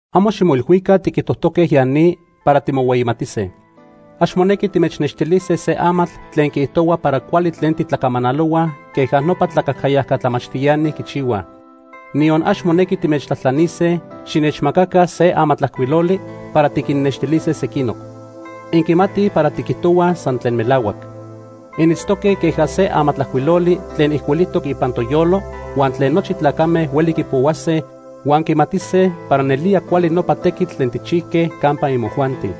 Amo ximoilhuica tiquijtojtoque ya ni para timohueyimatise. Ax monequi timechnextilise se amatl tlen quiijtohua para cuali tlen titlacamanalohua queja nopa tlacajcayajca tlamachtiani quichihuaj. Niyon ax monequi timechtlajtlanise xinechmacaca se amatlajcuiloli para tiquinnextilise sequinoc. Inquimatij para tiquijtohuaj san tlen melahuac. Initztoque queja se amatlajcuiloli tlen ijcuilijtoc ipan toyolo huan tlen nochi tlacame hueli quipohuase huan quimatise para nelía cuali nopa tequitl tlen tijchijque campa imojuanti.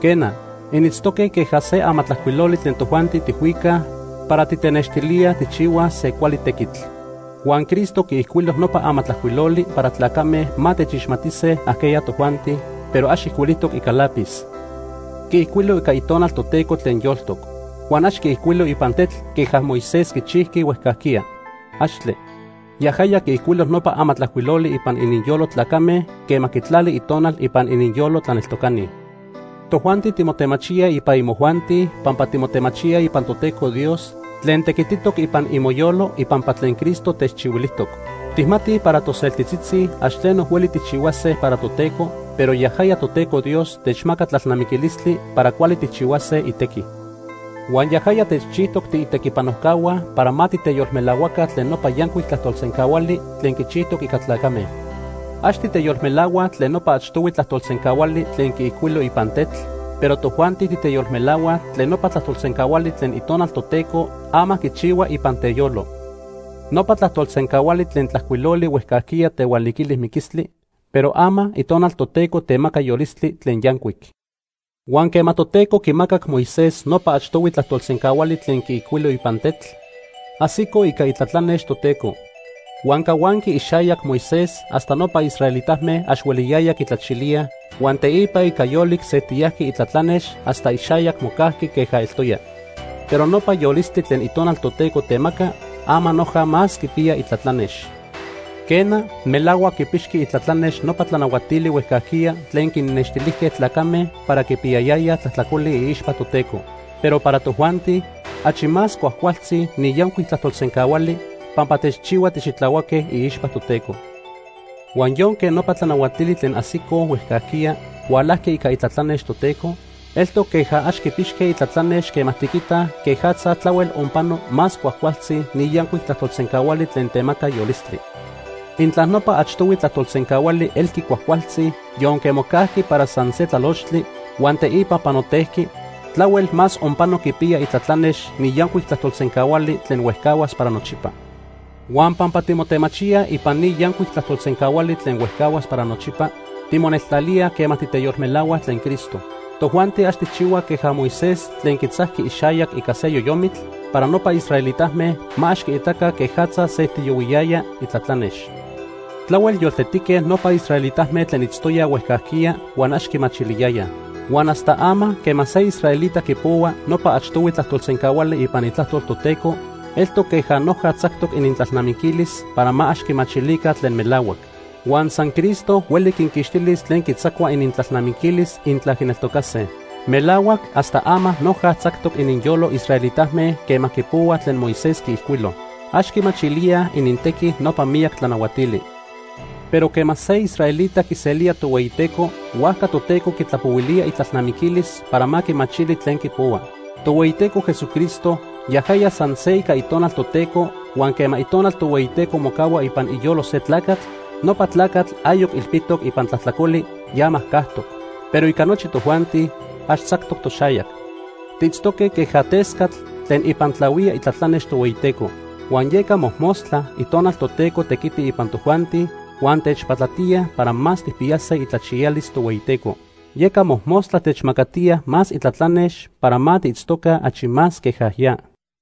Quena, initztoque queja se amatlajcuiloli tlen tojuanti tijhuicaj para titenextilíaj tijchihuaj se cuali tequitl. Huan Cristo quiijcuilo nopa amatlajcuiloli para tlacame ma techixmatise ajqueya tojuanti, pero ax ijcuilijtoc ica lápiz. Quiijcuilo ica Itonal Toteco tlen yoltoc. Huan ax quiijcuilo ipan tetl queja Moisés quichijqui huejcajquiya. ¡Axtle! Yajaya quiijcuilo nopa amatlajcuiloli ipan ininyolo tlacame quema quitlali Itonal ipan ininyolo tlaneltocani. Tojuanti timotemachíaj ipan imojuanti pampa timotemachíaj ipan Toteco Dios tlen tequititoc ipan imoyolo ipampa tlen Cristo techchihuilijtoc. Tijmatij para toseltitzitzi ax tleno hueli tijchihuase para Toteco, pero yajaya Toteco Dios techmaca tlalnamiquilistli para cuali tijchihuase itequi. Huan yajaya techchijtoc tiitequipanojcahua para ma titeyolmelahuaca tlen nopa yancuic tlajtolsencahuali tlen quichijtoc ica tlacame. Ax titeyolmelahuaj tlen nopa achtohui tlajtolsencahuali tlen quiijcuilo ipan tetl, pero tojuanti titeyolmelahuaj tlen nopa tlajtolsencahuali tlen Itonal Toteco ama quichihua ipan teyolo. Nopa tlajtolsencahuali tlen tlajcuiloli huejcajquiya tehualiquili miquistli, pero ama Itonal Toteco temaca yolistli tlen yancuic. Huan quema Toteco quimacac Moisés nopa achtohui tlajtolsencahuali tlen quiijcuilo ipan tetl, ajsico ica itlatlanex Toteco. Huan cahuanqui ixayac Moisés hasta nopa israelitame ax hueliyayaj quitlachilíaj, huan teipa ica yolic sejtiyajqui itlatlanex hasta ixayac mocajqui queja eltoya. Pero nopa yolistli tlen Itonal Toteco temaca ama noja más quipiya itlatlanex. Quena, melahuac quipixqui itlatlanex nopa tlanahuatili huejcajquiya tlen quinnextilijque tlacame para quipiyayayaj tlajtlacoli iixpa Toteco. Pero para tojuanti achi más cuajcualtzi ni yancuic tlajtolsencahuali pampa techchihua tixitlahuaque iixpa Toteco. Huan yonque nopa tlanahuatili tlen ajsicoj huejcajquiya hualajqui ica itlatlanex Toteco, eltoc queja ax quipixque itlatlanex quema tiquitaj quejatza tlahuel onpano más cuajcualtzi ni yancuic tlajtolsencahuali tlen temaca yolistli. Intla nopa achtohui tlajtolsencahuali elqui cuajcualtzi yonque mocajqui para san se tlalochtli huan teipa panotejqui, tlahuel más onpano quipiya itlatlanex ni yancuic tlajtolsencahuali tlen huejcahuas para nochipa. Huan pampa timotemachíaj ipan ni yancuic tlajtolsencahuali tlen huejcahuas para nochipa, timoneltlalíaj quema titeyolmelahuaj tlen Cristo. Tojuanti ax tijchihuaj queja Moisés tlen quitzajqui ixayac ica se yoyomitl para nopa israelitame ma ax quiitaca quejatza sejtiyohuiyaya itlatlanex. Tlahuel yoltetique nopa israelitame tlen itztoyaj huejcajquiya huan ax quimachiliyayaj. Huan hasta ama quema se israelita quipohua nopa achtohui tlajtolsencahuali ipan Itlajtol Toteco, eltoc queja noja tzactoc inintlalnamiquilis para ma ax quimachilica tlen melahuac. Huan san Cristo hueli quinquixtilis tlen quitzacua inintlalnamiquilis intla quineltocase. Melahuac hasta ama noja tzactoc ininyolo israelitame quema quipohuaj tlen Moisés quiijcuilo. Ax quimachilíaj inintequi nopa miyac tlanahuatili. Pero quema se israelita quiselía Tohueyiteco, huajca Toteco quitlapohuilía itlalnamiquilis para ma quimachili tlen quipohua. Tohueyiteco Jesucristo yajaya san se ica Itonal Toteco, huan quema Itonal Tohueyiteco mocahua ipan iyolo se tlacatl, nopa tlacatl ayoc ilpitoc ipan tlajtlacoli, ya majcajtoc. Pero ica nochi tojuanti, ax tzactoc toxayac. Tiitztoque queja tescatl tlen ipan tlahuía itlatlanex Tohueyiteco. Huan yeca mojmostla Itonal Toteco tequiti ipan tojuanti huan techpatlatiya para más tijpiyase itlachiyalis Tohueyiteco. Yeca mojmostla techmacatiya más itlatlanex para ma tiitztoca achi más queja ya.